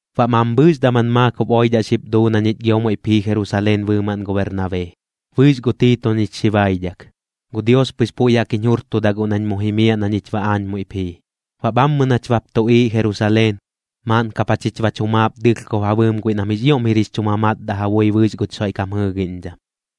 Baꞌ mambhɨɨx daman maakob oidhaꞌ xip duu na ñich gio muiꞌp jii Jerusaleen bɨɨmaꞌn gu Bernabee, bɨɨx gu Tiito ñich xi baidhak. Gu Dios pɨx puiꞌ jaꞌk jiñ jurtuda guꞌ nañ mu jimiaꞌ na ñich baꞌ aañ muiꞌp jii. Baꞌ bhammɨ nach bap tuꞌiiꞌ Jerusaleen, maaꞌn kap jachich bach jumaap dɨlhkob ja bɨɨm guiꞌ nam jɨꞌk jix ioꞌm jir jix chu mamatdaꞌ ja bui bɨɨx guch Xoiꞌkam jɨɨgiꞌñdham.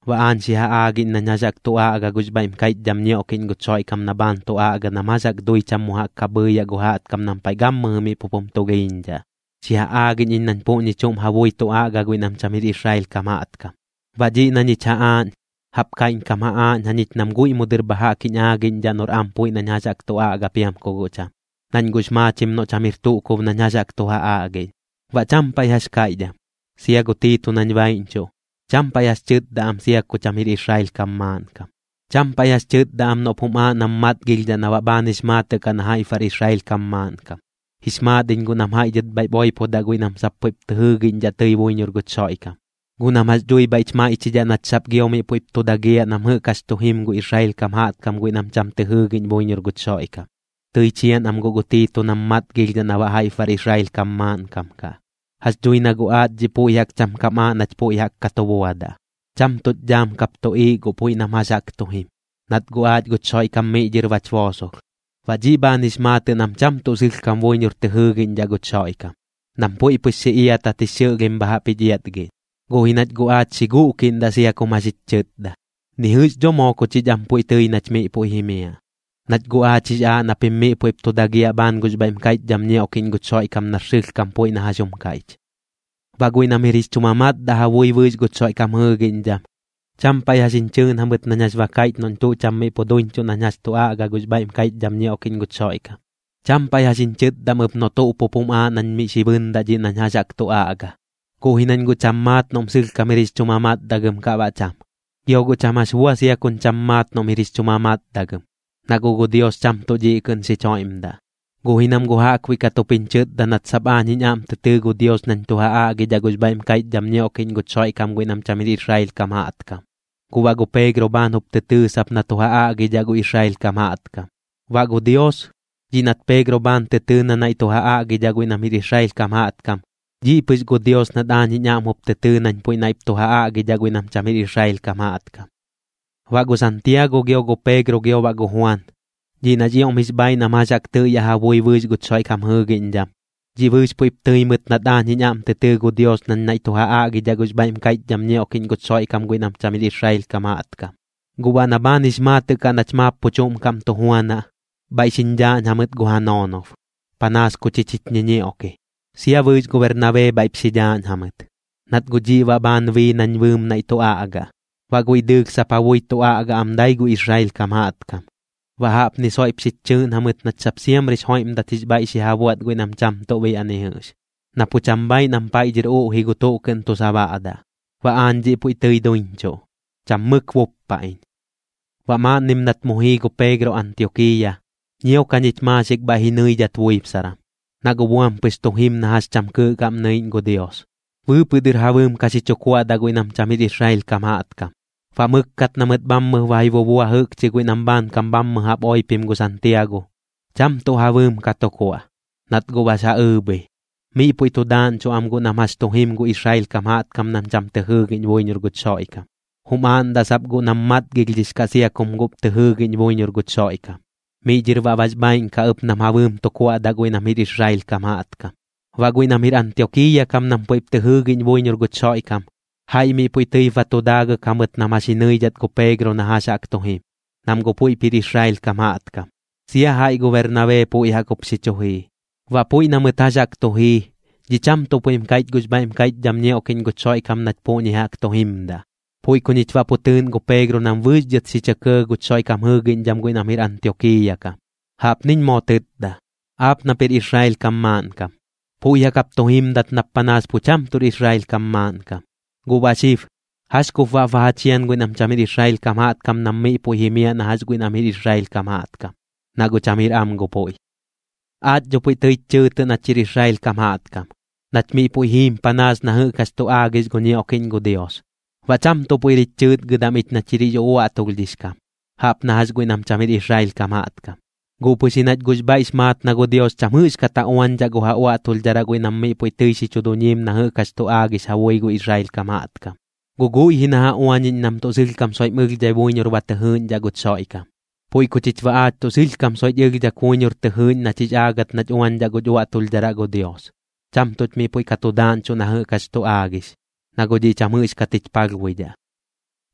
Baꞌ aañ xi ja aagiꞌñ nañ jax jaꞌk tu aꞌga gux bhaiꞌm kaiꞌchdham ñioꞌkiꞌñ guch Xoiꞌkam na bhaan tu aꞌga nam jax jaꞌk dui cham mu jaꞌk ka bhɨɨyaꞌ gu jaꞌtkam nam paiꞌ gammɨjɨ miꞌ pup jum tulhiiñdhaꞌ, xi ja aagiꞌñ iñ nañ puꞌñi chuꞌm ja bui tu aꞌga guiꞌ nam cham jir Israel kam jaꞌtkam. Baꞌ dhiꞌ na ñich ja aaꞌñ, jaꞌp kaiꞌñkam ja aaꞌñ jañich nam guiꞌ mu dɨr bha jaꞌk jiñ aagiꞌñdhaꞌ noꞌr am puiꞌ nañ jax jaꞌk tu aꞌga piam ku guꞌ cham, nañ guꞌx maachim noꞌ cham jir tuꞌ kub nañ jax jaꞌk tu ja aꞌgiꞌñ. Baꞌ cham paiꞌ jax kaiꞌch am. Sia gu Tiito nañ baiꞌñchuꞌ, cham paiꞌ jax tɨtda am sia ku cham jir Israel kam maaꞌnkam. Cham paiꞌ jax tɨtda am noꞌp jum aaꞌ nam matgilhdhaꞌ na baꞌ bhaan bax maatɨꞌ kaꞌ na jaiꞌp bar Israel kam maaꞌnkam. Jix maat iñ guꞌ nam jaiꞌ dhɨt bhaiꞌp oipodaꞌ guiꞌ nam sap puiꞌp tɨ jɨɨgiꞌñdhaꞌ tɨi buiñor guch Xoiꞌkam, guꞌ nam jax dhui bhaiꞌch maiꞌchidhaꞌ nach sap gio miꞌ puiꞌp tu dagiaꞌ nam jɨꞌk jax tu jim gu Israel kam jaꞌtkam guiꞌ nam cham tɨ jɨɨgiꞌñ buiñor guch Xoiꞌkam. Tɨi chian am guꞌ gu Tiito nam matgilhdhaꞌ na baꞌ jaiꞌp bar Israel kam maaꞌnkam kaꞌ. Jax dhui na guꞌ aach dhiꞌ puiꞌ jaꞌk cham kam aaꞌ nach puiꞌ ka tu buadaꞌ, cham tuꞌch dhaam kap tuꞌiiꞌ guꞌ puiꞌ nam jax jaꞌk tu jim, nat guꞌ aach guch Xoiꞌkam miꞌ dhɨr bach boosolh. Baꞌ dhiꞌ bhaan jix maatɨꞌ nam cham tuꞌ sɨlhkam buiñor tɨ jɨɨgiꞌñdhaꞌ guch Xoiꞌkam, nam puiꞌ pɨx xi iatat jix xɨꞌlhim bha jaꞌp jich iatgiꞌñ. Guꞌ ji nach guꞌ aach xi guꞌkiꞌndaꞌ sia kum jax jich chɨtda, ni jɨꞌx dho moo ku chich am puiꞌ tɨi nach miꞌ puiꞌ jimiaꞌ, nach guꞌ aach jix aaꞌ na pim miꞌ puiꞌp tu dagiaꞌ bhaan gux bhaiꞌm kaiꞌchdham ñioꞌkiꞌñ guch Xoiꞌkam nar sɨlhkam puiꞌ na jax jum kaiꞌch. Baꞌ guiꞌ nam jir jix chu mamatdaꞌ ja bui bɨɨx guch Xoiꞌkam jɨɨgiꞌñdham, cham paiꞌ jax jiñ chɨɨꞌn jamɨt nañ jax ba kaiꞌch noꞌñ tuꞌ cham miꞌ pu duiñchuꞌ nañ jax tu aꞌga gux bhaiꞌm kaiꞌchdham ñioꞌkiꞌñ guch Xoiꞌkam. Cham paiꞌ jax jiñ chɨtdam ɨp noꞌ tuꞌ pup jum aaꞌ nañ miꞌ xi bɨndaꞌ dhiꞌ nañ jax jaꞌk tu aꞌga. Guꞌ ji nañ guꞌ cham maat noꞌm sɨlhkam jir jix chu mamatdagɨm kaꞌ baꞌ cham. Gio guꞌ cham jax bua sia kuñ cham maat noꞌm jir jix chu mamatdagɨm, na guꞌ gu Dios cham tuꞌ dhiꞌ kɨꞌn xich joiꞌmdaꞌ. Guꞌ ji nam guꞌ jaꞌkbuiꞌ kat jup jiñ chɨtda nat sap aañ jiñ aꞌm tɨ tɨɨ gu Dios nañ tu ja aꞌgidhaꞌ gux bhaiꞌm kaiꞌchdham ñioꞌkiꞌñ guch Xoiꞌkam guiꞌ nam cham jir Israel kam jaꞌtkam, guꞌ baꞌ gu Peegro bhaan jup tɨ tɨɨ sap na tu ja aꞌgidhaꞌ gu Israel kam jaꞌtkam. Baꞌ gu Dios, dhiꞌ nat Peegro bhaan tɨ tɨɨ na naiꞌ tu ja aꞌgidhaꞌ guiꞌ nam jir Israel kam jaꞌtkam, dhiꞌ pɨx gu Dios nat aañ jiñ aꞌm jup tɨ tɨɨ nañ puiꞌ naiꞌp tu ja aꞌgidhaꞌ guiꞌ nam cham jir Israel kam jaꞌtkam. Baꞌ gu Santiago gio gu Peegro gio baꞌ gu Juan, dhiꞌ nax ioꞌm jix bhaaiꞌ nam jax jaꞌk tɨꞌyaꞌ ja bui bɨɨx guch Xoiꞌkam jɨɨgiꞌñdham, dhiꞌ bɨɨx puiꞌp tɨi mɨt nat aañ jiñ aꞌm tɨ tɨɨ gu Dios nañ naiꞌ tu ja aꞌgidhaꞌ gux bhaiꞌm kaiꞌchdham ñioꞌkiꞌñ guch Xoiꞌkam guiꞌ nam cham jir Israel kam jaꞌtkam. Guꞌ baꞌ na bhaan jix maatɨꞌ kaꞌ nach maap pu chuꞌm kaꞌm tu juanaꞌ, bhaiꞌ xiñ dhaaꞌñ jamɨt gu ja noonob, panaas ku chich jich ñiñioꞌki, sia bɨɨx gu Bernabee bhaiꞌp xi dhaaꞌñ jamɨt, nat guꞌ dhiꞌ baꞌ bhaan bii nañ bɨɨm naiꞌ tu aꞌgaꞌ. Baꞌ guiꞌ dɨɨlh sap ja bui tu aꞌga am dai gu Israel kam jaꞌtkam. Baꞌ jaꞌpni soiꞌp xich chɨɨꞌn jamɨt nach sap siamrix joiꞌmdat jix bhaiꞌ xi ja buaꞌt guiꞌ nam cham tuꞌ biaꞌ ni jɨꞌx, na pu cham bhaaiꞌ nam paiꞌ dhɨr uꞌji gu tuꞌ kɨꞌn tu sabaꞌdaꞌ. Baꞌ aañ dhiꞌ puiꞌ tɨi duiñchuꞌ, cham mɨk buppa iñ. Baꞌ maaꞌnnim nat mu jii gu Peegro Antiokiiya, ñiok jañich maaxik bhaiꞌ ji nɨidhat buibsaram, na guꞌ buam pɨx tu jim na jax cham kɨɨꞌ kaꞌm nɨiꞌñ gu Dios. Bɨɨpɨꞌ dɨr ja bɨɨm ka xi chu kuaꞌdaꞌ guiꞌ nam cham jir Israel kam jaꞌtkam. Baꞌ mɨkkat na mɨt bhammɨp ba ji bubua jɨꞌkchi guiꞌ nam bhaankam bhammɨ jaꞌp oipim gu Santiago, cham tuꞌ ja bɨɨm ka tu kuaꞌ, nat guꞌ bax ja ɨɨbhi. Miꞌ puiꞌ tu daaꞌñchuꞌ am guꞌ nam jax tu jim gu Israel kam jaꞌtkam nam cham tɨ jɨɨgiꞌñ buiñor guch Xoiꞌkam, jum aaꞌndaꞌ sap guꞌ nam matgilhdhix kaꞌ sia kum guꞌp tɨ jɨɨgiꞌñ buiñor guch Xoiꞌkam, miꞌ dhɨr baꞌ bax bhaaiꞌn kaꞌ ɨp nam ja bɨɨm tu kuaꞌdaꞌ guiꞌ nam jir Israel kam jaꞌtkam. Baꞌ guiꞌ nam jir Antiokiiya kam nam puiꞌ tɨip tɨ jɨɨgiꞌñ buiñor guch Xoiꞌkam, jaiꞌ miꞌ puiꞌ tɨip ba tu daagɨk jamɨt nam jax ji ñɨidhat gu Peegro na jax jaꞌk tu jim, nam guꞌ puiꞌp jir Israel kam jaꞌtkam, sia jaiꞌ gu Bernabee puiꞌ jaꞌk jup xi chu jii. Baꞌ puiꞌ na mɨt jax jaꞌk tu jii, dhiꞌ cham tuꞌ puiꞌm kaiꞌch gux bhaiꞌm kaiꞌchdham ñioꞌkiꞌñ guch Xoiꞌkam nach puꞌñi jaꞌk tu jimdaꞌ. Puiꞌ ku ñich baꞌ pu tɨɨꞌn gu Peegro nam bɨɨx dhɨt xi chɇ kɇɇ guch Xoiꞌkam jɨɨgiꞌñdham guiꞌ nam jɨꞌk jir Antiokiiya kam. Jaꞌpniñ moo tɨtda: “Aap nap jir Israel kam maaꞌnkam, puiꞌ jaꞌk jap tu jimdat nap panaas pu cham tuꞌr Israel kam maaꞌnkam. Guꞌ baꞌ xib, ¿jax kup baꞌp ba ja chian guiꞌ nam cham jir Israel kam jaꞌtkam nam miꞌ puiꞌ jimiaꞌ na jax guiꞌ nam jir Israel kam jaꞌtkam? Na guꞌ cham jir am gu puiꞌ.” Aach dho pui tɨich chɨɨtɨꞌ nach jir Israel kam jaꞌtkam, nach miꞌ puiꞌ jiim panaas na jɨꞌk jax tu aagix gu ñioꞌkiꞌñ gu Dios, baꞌ cham tuꞌ puiꞌr jich chɨɨtgɨdam ich nach jir jix uꞌuaꞌtulhdhix kam, jaꞌp na jax guiꞌ nam cham jir Israel kam jaꞌtkam. Guꞌ pɨx ji nach guꞌx bhaiꞌx maat na gu Dios cham jɨꞌxkat ja uañdhaꞌ gu ja uaꞌtulhdharaꞌ guiꞌ nam miꞌ puiꞌ tɨi xi chu duñiim na jɨꞌk jax tu aagix ja bui gu Israel kam jaꞌtkam, guꞌ guiꞌ ji na ja uañiꞌñ nam tuꞌ sɨlhkam soiꞌm ɨlhdhai buiñor ba tɨ jɨɨꞌñdhaꞌ guch Xoiꞌkam. Puiꞌ ku chich baꞌ aach tuꞌ sɨlhkam soiꞌch ɨlhdhak buiñor tɨ jɨɨꞌñ nach jix aagɨt nach uañdhaꞌ guch uaꞌtulhdharaꞌ gu Dios, cham tuꞌch miꞌ puiꞌ ka tu daaꞌñchuꞌ na jɨꞌk jax tu aagix, na guꞌ dhiꞌ cham jɨꞌxkat jich palhbuidhaꞌ.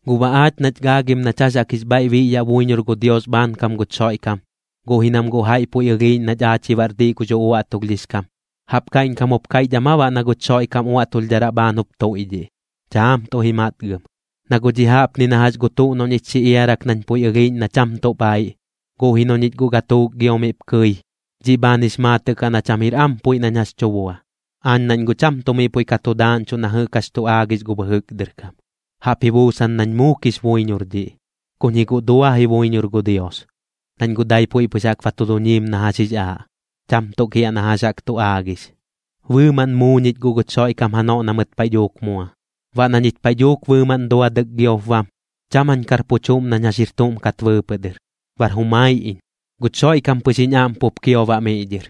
Guꞌ baꞌ aach nach gaagim nach jax jaꞌk jix bhaiꞌ biꞌyaꞌ buiñor gu Dios bhaankam guch Xoiꞌkam, guꞌ ji nam guꞌ jaiꞌ puiꞌ ɨlhiiꞌñ nach aach ji baꞌr diꞌ gux uꞌuaꞌtulhdhix kam, ¿jaꞌp kaiꞌñkam jup kaiꞌchdhaꞌm aa baꞌ na guch Xoiꞌkam uaꞌtulhdharaꞌ bhaan jup tuiꞌdhiꞌ? Chaam tuꞌ ji matgɨm. Na guꞌ dhiꞌ jaꞌpni na jax gu tuꞌ noꞌ ñich xi iarak nañ puiꞌ ɨlhiiꞌñ na cham tuꞌ bhaiꞌ, guꞌ ji noꞌ ñich guꞌ gatuuk gio miꞌp kɨi, dhiꞌ bhaan jix maatɨꞌ kaꞌ na cham jir am puiꞌ nañ jax tu bua. Aañ nañ guꞌ cham tuꞌ miꞌ puiꞌ ka tu daaꞌñchuꞌ na jɨꞌk jax tu aagix gu bɨjɨk dɨr kam, jaꞌp ji buusan nañ muukix buiñor dhiꞌ. Kuñ ji guꞌ dua ji buiñor gu Dios, nañ guꞌ dai puiꞌ pɨx jaꞌk ba tu duñiim na jax jix aaꞌ, cham tuꞌ kiaꞌ na jax jaꞌk tu aagix. Bɨɨmaꞌn muu ñich guꞌ guch Xoiꞌkam janoꞌ na mɨt paiꞌ dhuuk mua. Baꞌ na ñich paiꞌ dhuuk bɨɨmaꞌn duadɨk giop bam, cham jañ kar pu chuꞌm nañ jax jir tuꞌm kat bɨɨpɨꞌ dɨr, bar jumai iñ. Guch Xoiꞌkam pɨx jiñ aꞌm pup kio baꞌ miꞌ dhɨr,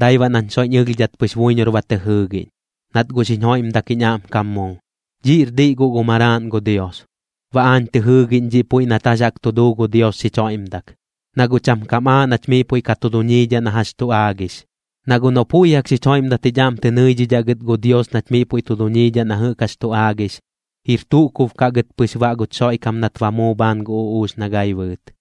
dai baꞌ nañ soiꞌñ ɨlhdhat pɨx buiñor ba tɨ jɨɨgiꞌñ, nat guꞌ xiñ joiꞌmdak jiñ aꞌmkam muu. Dhiꞌr diꞌ guꞌ gu Maraaꞌn gu Dios. Baꞌ aañ tɨ jɨɨgiꞌñ dhiꞌ puiꞌ nat jax jaꞌk tu duu gu Dios xich joiꞌmdak, na guꞌ cham kam aaꞌ nach miꞌ puiꞌ ka tu duñiidhaꞌ na jax tu aagix. Na guꞌ noꞌ puiꞌ jaꞌk xich joiꞌmdat jich aꞌm tɨ nɨidhidhaꞌ gɨt gu Dios nach miꞌ puiꞌ tu duñiidhaꞌ na jɨꞌk jax tu aagix, jir tuꞌ kub kaꞌ gɨt pɨx baꞌ guch Xoiꞌkam nat ba muu bhaan gu uꞌuux na gai bɨɨt.